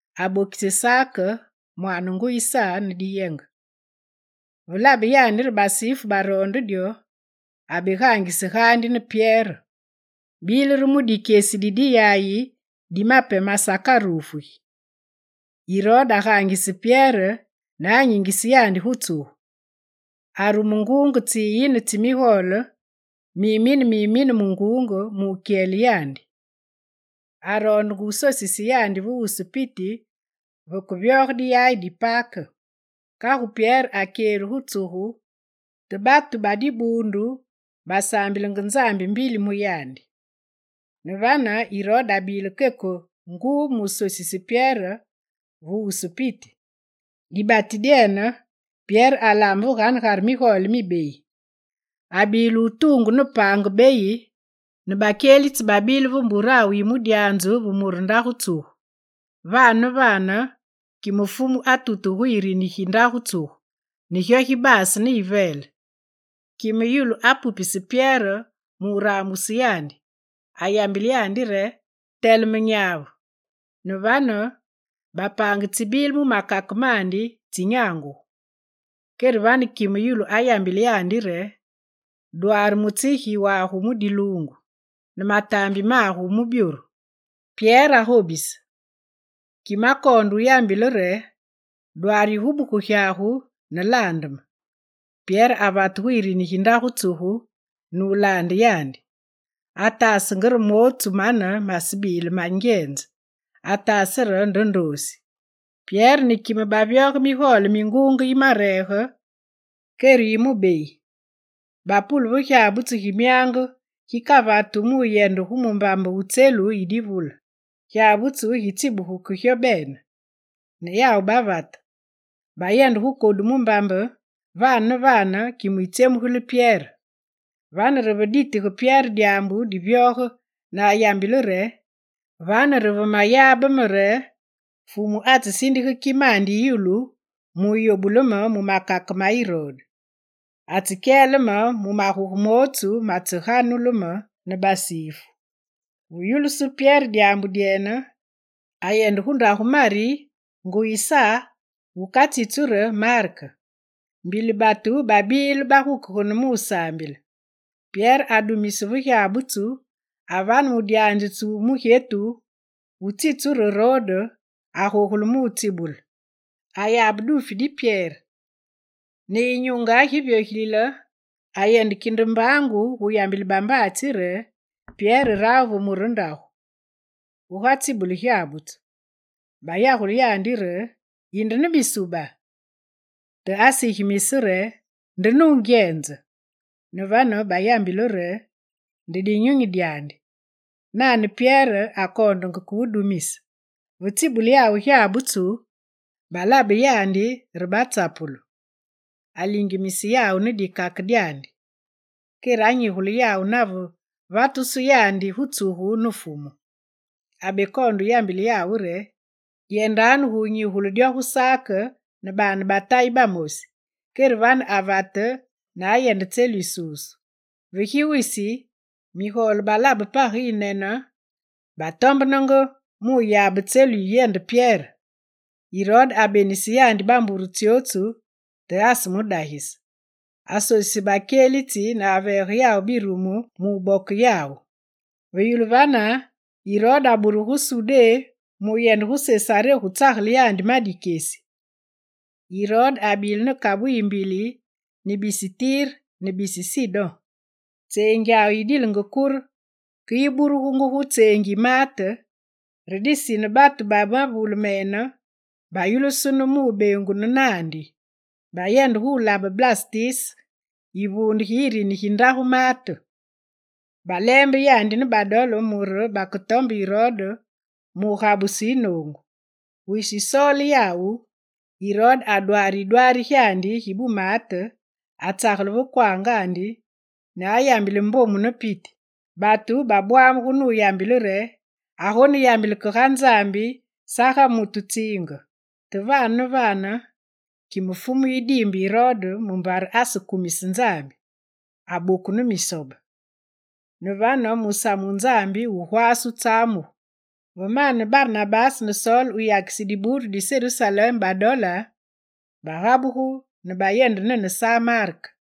Abokise Sake, mwaane nguyi Sa ne diyenge. Ve labe yandi re basifu baroonde dyo, abegaangise gaandi ne Pyere. Bile re mu dikyesi di diyaye di Mape masakarufugi. Irode agaangise Pyere ne anyingise yandi gu tsugu. Arume nguunge tsiyine tsi migole, mimine mimine mu nguunge mu wukyele yandi. Aroondenge wusosise yandi ve wusu piti vekevyoge diyaye di Pake. Kagu Pyere akyelu gu tsugu, te batu ba dibuundu basaambilenge Nzambi mbili mu yandi. Ne vane, Irode abile keke nguu musosise Pyere ve wusu piti. Dibati dyene, Pyere alaame ve veganegare migole mibeyi. Abile wutuungu ne paange beyi ne bakyelitsi babile ve mburawu yi mudyanzu ve mure ndagu tsugu. Vane ne vane, kime Fumu atutuge gu yirini gi ndagu tsugu ne gyo gibaase ne yiveele. Kime yulu apupise Pyere mu raambuse yandi. Ayambile yandi re: «Teleme nyavu!» Ne vane bapaange tsibile mu makake mandi tsinyangugu. Kere vane kime yulu ayambile yandi re: «Dwaare mutsigi wagu mu diluungu ne mataambi magu mu byoru.» Pyere agobise. Kime akoonde yambile re: «Dwaare yigubuku gyagu ne laande me.» Pyere avate gu yirini gi ndagu tsugu ne wulaande yandi. Ataasenge re mootsu mane masebile ma nungyenze, ataase nde re ndoosi. Pyere ne kime bavyoge migole mi nguunge yimareege, kere yi mubeyi. Bapule ve gyabutsu gi myaange gikavatu mu wuyende gu mumbambe wu tselu yi divule. Gyabutsu gitsibuge ke gyo bene ne yawu bavate. Bayende gu kodu mumbambe, vane ne vane, kime yitsyemugile Pyere. Vane re ve ditige Pyere dyaambu divyoge ne ayambile re: «Vane re ve mayabe me re Fumu atsesindige kimandi yi yulu mu wuyobule me mu makake ma Irode. Atsekyele me mu maguge mootsu matseganulu me ne basifu.» Ve yulusu Pyere dyaambu dyene, ayende gu ndagu Mari, nguyi Sa wukatsitsu ne re Mark. Mbili batu babile bagukegene mu wusaambile. Pyere adumise ve gyabutsu avane mudyanzitsi wu mugyetu wutsitsu re Roode, agogule mu wutsibule. Ayabe duufi di Pyere, ne yinyunge giviogilile, ayende kinde mbaangu gu wuyambile bambaatsi re Pyere rawu ve mure ndagu, guga tsibule gyabutsu. Bayagule yandi re: «Yinde ne misuba!» Te asigimise re nde nungyenze. Ne vane bayambile re: «Nde dinyunyi dyandi.» Nane Pyere akoondenge ke wudumise. Ve tsibule yawu gyabutsu balabe yandi re batsapulu. Alingimise yawu ne dikake dyandi. Kere anyigule yawu nave vatusu yandi gu tsugu ne Fumu. Abekoonde wuyambile yawu re: «Yendanu gu wunyigule dyo gu Sak ne baane ba Tayi bamosi.» Kere vane avate ne ayende tselu yisusu. Vegi wisi, migole balabe page yinyinene, batombenenge mu wuyabe tselu yiyende Pyere. Irode abenise yandi bambure tsyootsu te asemudagise. Asosise bakyelitsi ne aveege birumu mubokise yawu. Ve yulu vane, Irode aburugu gu Sudé mu wuyende gu Sesaré gu tsagele yandi ma dikyesi. Irode abile ne kabu yiyimbili ne bisi Tire ne bisi Sidon. Tseengyawu yidilenge kure ke yiburugungu gu tseengi yi maate, re disine batu ba mavule mene bayulusunu mu wubeengunu naandi. Bayende gu wulabe Blastise, yivuunde gi yirini gi ndagu maate. Baleembe yandi ne badole mure baketombe Irode mu wugabuse yinoongu. Wisi wusoole yawu, Irode adwaare yidwaari gyandi gi bumaate, atsagele ve kwaangandi ne ayambile mbomu ne piti. Batu babwamuge nuyambile re: «Agoneyambile ke ga Nzambi saga mutu tsiinge.» Te vane ne vane, kime Fumu yidiimbe Irode mumbare asekumise Nzambi: aboku ne misobe. Ne vane musamu wu Nzambi wugwaase wutsamugu. Ve mane Barnabase ne Sol wuyakise dibuundu di Serusalem badole, bagabugu ne bayende nene Sa Mark.